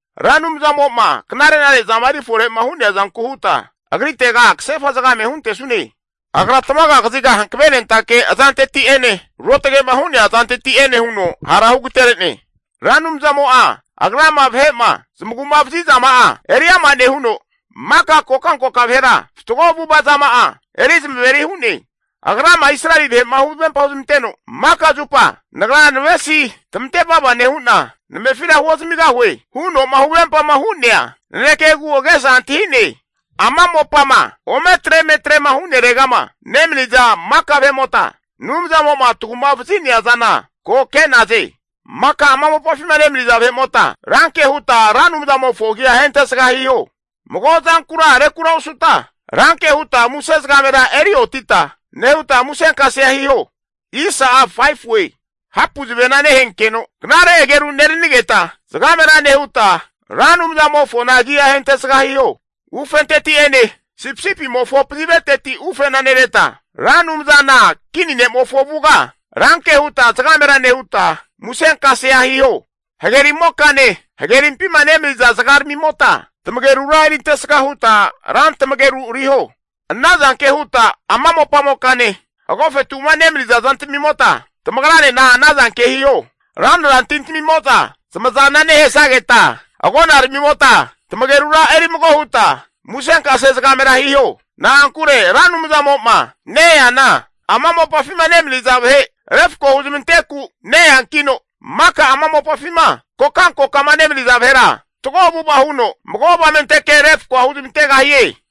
Ra Anumzamo'ma knare'nare zama erifore'ma hu'nea zanku huta, Agritega kasefa zagame huntesune. Agra tamaga kaziga hankavenentake azanteti'ene, ruotage'ma hu'nea azanteti'ene huno hara hugatere'ne. Ra Anumzamo'a Agrama vahe'ma zamagu'ma vazizama'a eriama nehuno, maka kokankoka vahera fatgo avu'ava zama'a eri zamaveri hu'ne. Agrama Israeli vahe'ma huvempa huzmanteno, maka zupa nagra navesi tamante vava nehu'na, namefira huozamigahue huno'ma huvempama hu'nea nanekegu agesa antahi'ne. Ama mopama ometre emetre'ma hu'neregama nemaniza maka vahe'mota, Anumzamo'ma tagu'ma vazi'nea zana ko ke'naze. Maka ama mopafima nemaniza vahe'mota ranke huta Ra Anumzamofo agia ahentesga hiho. Mago zankura rekura osuta, ranke huta muse zagamera eri otita nehuta musenkasea hiho. Hapu zavena nehenkeno knare ageru neranigeta, zagamera nehuta Ra Anumzamofona agi'a ahentesga hiho. Ufenteti'ene sipisipimofo paziveteti ufena nereta, Ra Anumzana kini ne'mofo avuga ranke huta zagamera nehuta musenkasea hiho. Hagerimokane, hagerimpima nemaniza zagaramimota tamagerura erintesga huta rantamageru riho. Anazanke huta ama mopamokane, agofetu'ma nemaniza zantamimota tamagranena anazanke hiho. Ranra tintamimoza zamazana nehesageta, agonaramimota tamagerura eri mago huta musenkase zagamera hiho. Na'ankure Ra Anumzamo'ma ne-eana ama mopafima nemaniza vahe refko huzmanteku ne-eankino, maka ama mopafima kokankokama nemaniza vahera fatgo avu'ava huno, mago avamenteke refkoa huzmantegahie.